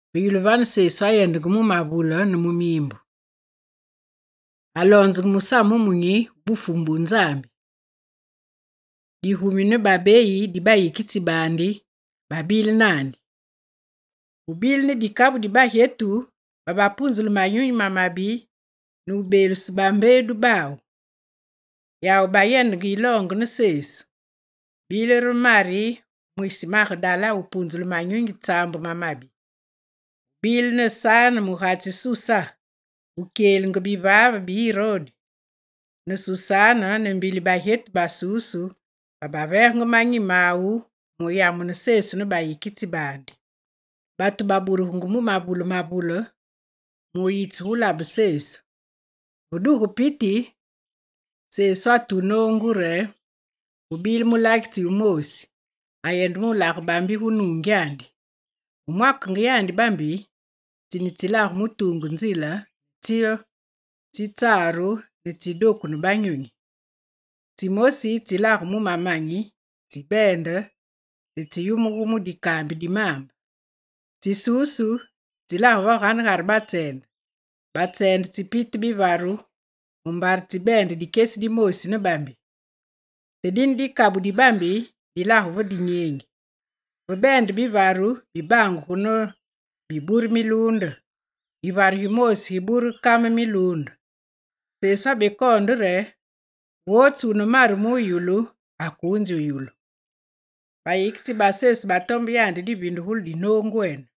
Ve yulu vane, Sesu ayendenge mu mavule ne mu miimbu. Aloonzenge musamu wumunyi wu Bufumu bu Nzambi. Digumi ne babeyi di bayikitsi baandi, babile naandi. Gubile ne dikabu dibagyetu babapunzulu manyunyi mamabi ne wubeelusu bambeedu bawu. Yawu bayendenge yiloonge ne Sesu. Bile re Mari mwisi Magedala wupunzulu manyunyi tsaambu mamabi. Gubile ne Sane, mugatsi Susa mukyelitsi bivaave bi Irode, ne Susane ne mbili bagyetu basusu babaveegenge manyi mawu muyamune Sesu ne bayikitsi baandi. Batu baburugengu mu mavule mavule, mu yitselabe Sesu. Ve duge piti, Sesu atu noongu re: «Gubile mulagitsi wumoosi, ayende mulage bambi gu nuungyandi. Ve mwakenge yandi bambi, tsine tsilage mu tuungu nzile ne tsyo tsitsaru ne tsidoku ne banyonyi. Tsimosi tsilage mu mamanyi, tsibeende te tsiyumugu mu dikaambi di maambe. Tsisusu tsilage veganegare batseende. Batseende tsipite bivaru mumbare tsibeende dikyesi dimoosi ne bambi. Te dine dikabu di bambi dilage ve dinyeengi. Ve beende bivaru, bibangugu ne bibure miluunde. Yivaru gimoosi gibure kame miluunde.» Sesu abekoonde re: «Wotsu wune maru muyulu, akuunzi wuyulu.» Bayikitsi ba Sesu batombe yandi divindugulu di noongwene.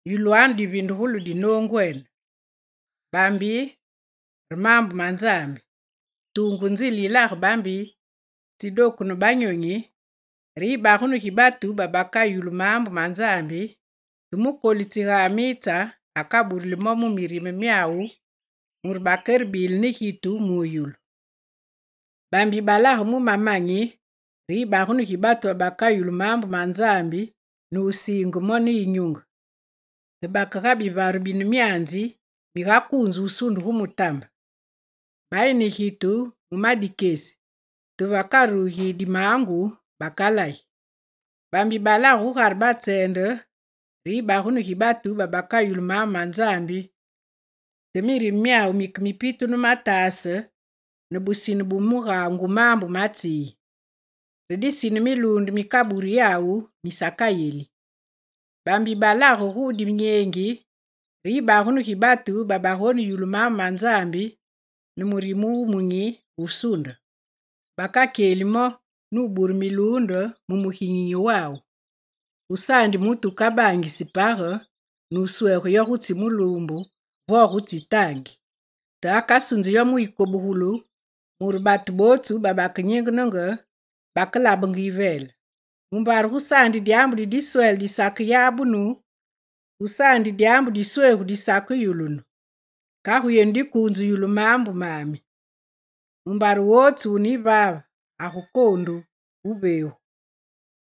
Yulwanu divindugulu di noongwene: bambi re maambu ma Nzambi. Tuungu nzile yilage bambi tsidoku ne banyonyi, re yibagunu gi batu babakayulu maambu ma Nzambi, te mukolitsi ga amitse, akaburuli mo mu mirime myawu, mure bakerebile ne gitu muyobulu. Bambi balage mu mamanyi re yibagunu gi batu babakayulu maambu ma Nzambi ne wusiinge mo ne yinyunge; te bake ga bivaru bine myanzi migakuunze wusunde gu mutambe. Bayi ne gitu mu ma dikyesi, te vekarugi dimaangu, bakalagi. Bambi balage gugare batseende re yibagunu gi batu babakayulu maambu ma Nzambi te mirime myawu mike mipitu ne mataase ne busine ne mugaangu maambu ma tsi yi. Re disine miluunde mikaburi yawu misakayeli. Bambi balage gu dinyeengi re yibagunu gi batu babagoneyulu maambu ma Nzambi ne murime wumunyi, wusuunde. Bakakyeli mo nubure miluunde mu muginyinyi wawu. Gusaandi mutu wukabangisi page, nuswege yo gutsi muluumbu, vo gutsi taangi. Te akasunzi yo mu yikobugulu mure batu bootsu babakenyingenenge, bakelabange yiveele. Mumbare gusaandi dyaambu di diswele disakeyabunu, gusaandi dyaambu diswegu disakeyulunu. Kagu yenu dikuunze yulu maambu mami. Mumbare wotsu wune yivaave agukoondu wuveegu,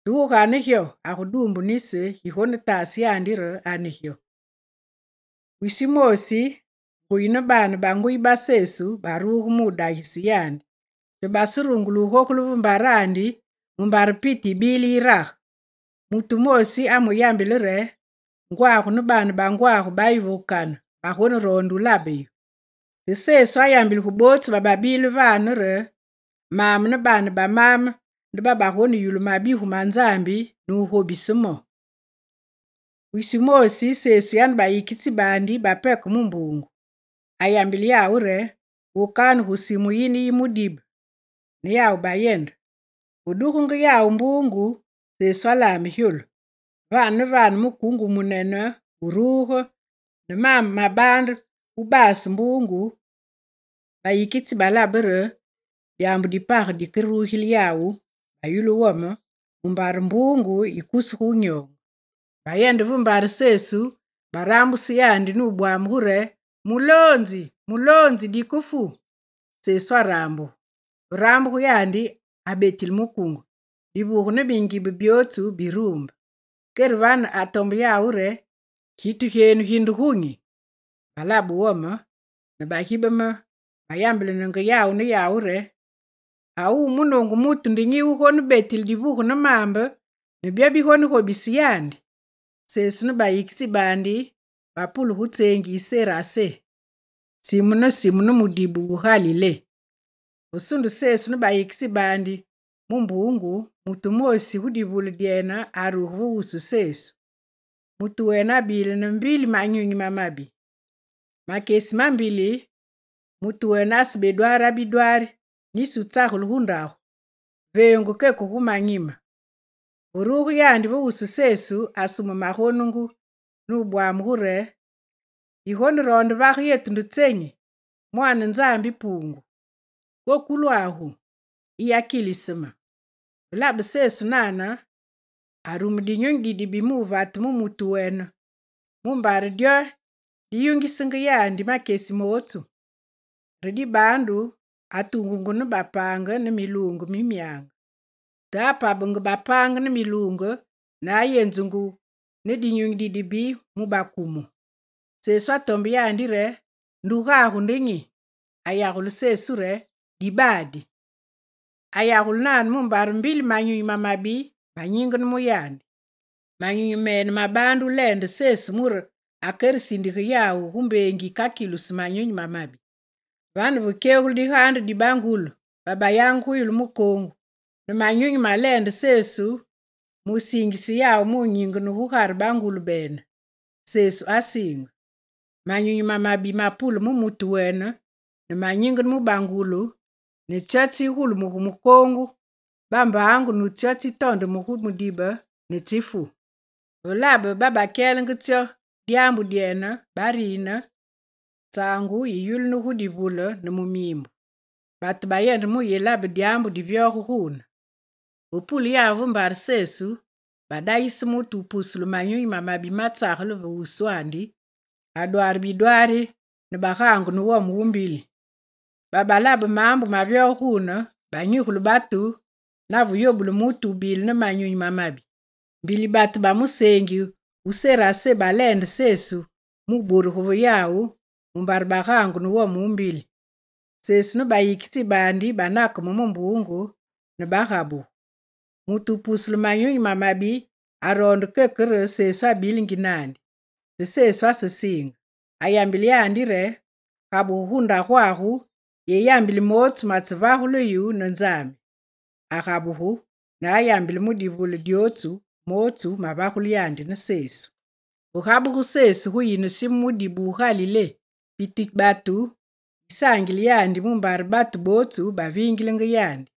te wugane gyo aguduumbu nisi gigonetaase yandi re ane gyo.» Wisi wumoosi, nguyi ne baane ba nguyi ba Sesu baruge mudagise yandi, te baserungule wugogule ve mbarandi, mumbare piti yibile yirage. Mutu wumoosi amuyambile re: «Ngwagu ne baane ba ngwagu bayi gu kane, bagoneroonde wulabe yu.» Te Sesu ayambile gu bootsu bababile vane re: «Maame ne baane ba maame nde babagoneyulu mabigu ma Nzambi ne wugobise mo.» Wisi wumoosi, Sesu yane bayikitsi baandi bapeke mu mbuungu. Ayambile yawu re: «Wokanu gu simu yine yi mudibe.» Ne yawu bayende. Ve dugenge yawu mbuungu, Sesu alame gyolu. Vane ne vane mukuunge wumunene wuruge ne maambe mabaande wubase mbuungu, bayikitsi balabe re dyaambu di page dikerugile yawu, bayulu wome, mumbare mbuungu yikusugu wunyoonge. Bayende ve mbare Sesu, barambuse yandi nubwamugu re: «Muloonzi! Muloonzi! Dikefu!» Sesu arambugu. Ve rambuge yandi, abetile mukuunge. Divuge ne mingibe, byootsu biruumbe. Kere vane atombe yawu re: «Gitu gyenu gi nde gunyi?» Balabe wome ne bagibeme bayambilenenge yawu ne yawu re: «A wu munoongu mutu nde nyi wugonebetile divuge ne maambe, ne byo bigonegobise yandi?» Sesu ne bayikitsi baandi bapule gu tseengi yi Serase; simu ne simu ne mudibe wu Galilé. Ve sunde Sesu ne bayikitsi baandi mu mbuungu, mutu wumoosi gu divule dyene aruge ve wusu Sesu. Mutu wene abile ne mbili manyunyi mamabi. Makyesi mambili mutu wene asebedwaara bidwaari nisi wutsagele gu ndagu, veengu keke gu manyime. Ve ruge yandi ve wusu Sesu, asume magonungu ne wubwamugu re: «Yigoneroonde vage me nde tsenyi, Mwaane Nzambi Puungu? Kokolwagu, yiyakilise me.» Ve labe Sesu nane arume dinyunyi dibibi muvate mu mutu wene mumbare dyo diyungisenge yandi makyesi mootsu. Re dibaandu atuungungu ne bapaange ne miluunge mi myange. Te apabenge bapaange ne miluunge ne ayenzungu ne dinyunyi didibi mu bakumu. Sesu atombe yandi re: «Ndugagu nde nyi?» Ayagule Sesu re: «Dibaadi.» Ayagule nane mumbare mbili manyunyi mamabi manyingene mu yandi. Manyunyi mene mabaande wuleende Sesu mure akeresindige yawu gu mbengi yikakilusu manyunyi mamabi. Vane vekyegulu digaande di bangulu bayangenge gu yulu mukoongu ne manyunyi maleende Sesu mu siingise yawu mu nyingene gugare bangulu bene. Sesu asiinge. Manyunyi mamabi mapule mu mutu wene ne manyingene mu bangulu ne tsyo tsigulumuge mukoongu bambaangu ne tsitondeme gu mudibe ne tsifu. Ve labe babakyelenge tsyo dyaambu dyene, barine, tsaangu yi yulunu gu divule ne mu miimbu. Batu bayende muyelabe dyaambu divyoge guune. Ve pule yawu ve mbare Sesu, badagise mutu wupusulu manyunyi mamabi matsagele ve wuswandi, adwaare bidwaari ne bagaangu ne wome wu mbili. Babalabe maambu mavyoge guune, banyigule batu nave yobulu mutu wubile ne manyunyi mamabi. Mbili batu ba museengi wu Serase baleende Sesu mu burugu ve yawu mumbare bagaangu ne wome wu mbili. Sesu ne bayikitsi baandi banakeme mu mbuungu ne bagabugu. Mutu wupusulu manyunyi mamabi aroonde keke re Sesu abilingi naandi, te Sesu asesiinge. Ayambile yandi re: «Gabugu gu ndagwagu yeyambili mootsu matsevagulu yu ne Nzambi.» Agabugu, ne ayambile mu divule dyotsu, mootsu mavagulu yandi ne Sesu. Ve gabuge Sesu gu yine simu mudibe wu Galilé, piti batu yisaangile yandi mumbare batu bootsu baviingilenge yandi.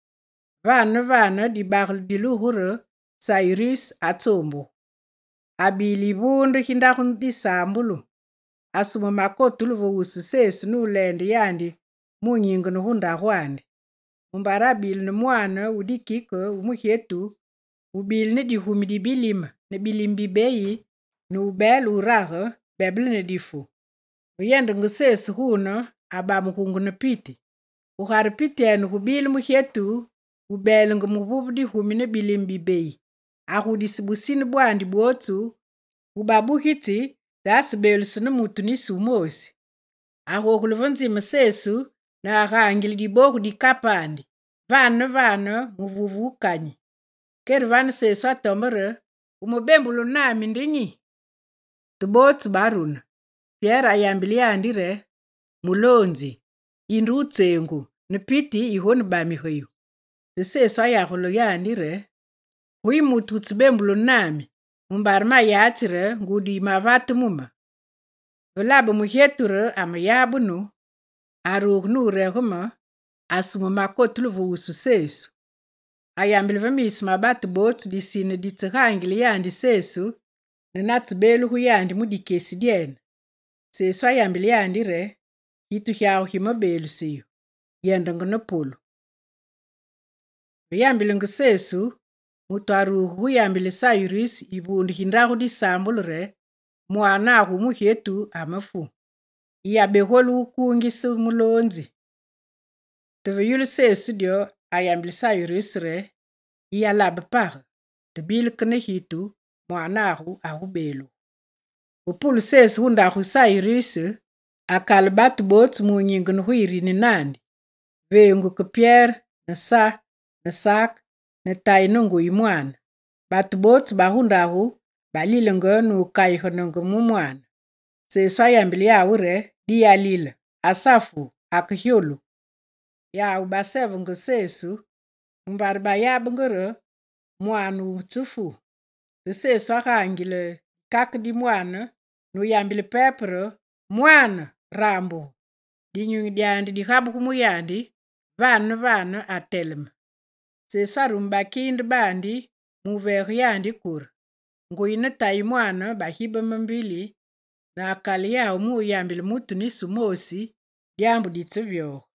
Vane ne vane dibagele dilugu re: Sayiruse atsoombugu. Abile yivuunde gi ndagu disaambulu. Asume makotulu ve wusu Sesu muleende yandi mu nyingene gu ndagwandi, mumbare abile ne mwaane wu dikike wu mugyetu wubile ne digumi di bilime ne bilime bibeyi ne wubeele wurage, bebele ne difu. Ve yendenge Sesu gune, abamugungu ne piti. Gugare pityene gubile mugyetu wubeelenge muvuve digumi ne bilime bibeyi, agudise busine bwandi bwotsu gu babugitsi, te asebeelusu ne mutu nisi wumoosi. Agogule ne ve nzime Sesu ne agaangile dibogu di kapandi, vane ne vane muvuve wandi wukanyi. Kere vane Sesu atombe re: «Wumebembulunu nami nde nyi?» Te bootsu barune. Pyere ayambile yandi re: «Muloonzi! Yinde wutseengu ne piti yigonebamige yu.» Te Sesu ayagule yandi re: «Guyi mutu wutsebembulunu nami mumbare mayatsi re ngudi yimevate mu me.» Ve labe mugyetu re ameyabunu, aruge nuregeme, asume makotulu ve wusu Sesu. Ayambile ve miisu ma batu bootsu disine ditsegaangile yandi Sesu, ne natsebeelugu yandi mu dikyesi dyene. Sesu ayambile yandi re: «Gitu gyagu gimebeeluse yu. Yendenge ne polu.» Ve yambilenge Sesu, mutu aruge guyambile Sayiruse yivuunde gi ndagu disaambulu re: «Mwaanagu wu mugyetu amafu, yiyabegolu wukingise muloonzi.» Te ve yulu Sesu dyo, ayambile Sayiruse re: «Yiyalabe page. Te bile ke ne gitu, mwaanagu agubeelugu.» Ve pule Sesu gu ndagu yi Sayiruse, akale batu bootsu munyingene gu yiriini naandi, veengu ke Pyere ne Sa ne Sake, ne tayi ne nguyi mwaane. Batu bootsu bagu ndagu balilenge, nukayigene mu mwaane. Sesu ayambile yawu re: «Diyalile, asafu akegyolu.» Yawu basevenge Sesu, mumbare bayabenge re mwaane wutsefu. Te Sesu agaangile dikake di mwaane nuyambile pepe re: «Mwaane, rambugu!» Dinyunyi dyandi digabugu mu yandi, vane ne vane ateleme. Sesu arume bakiinde mu veege yandi kure. Nguyi ne tayi mwaane bagibeme mbili ne akale yawu muyambile mutu nisi wumoosi dyaambu ditsevyoge.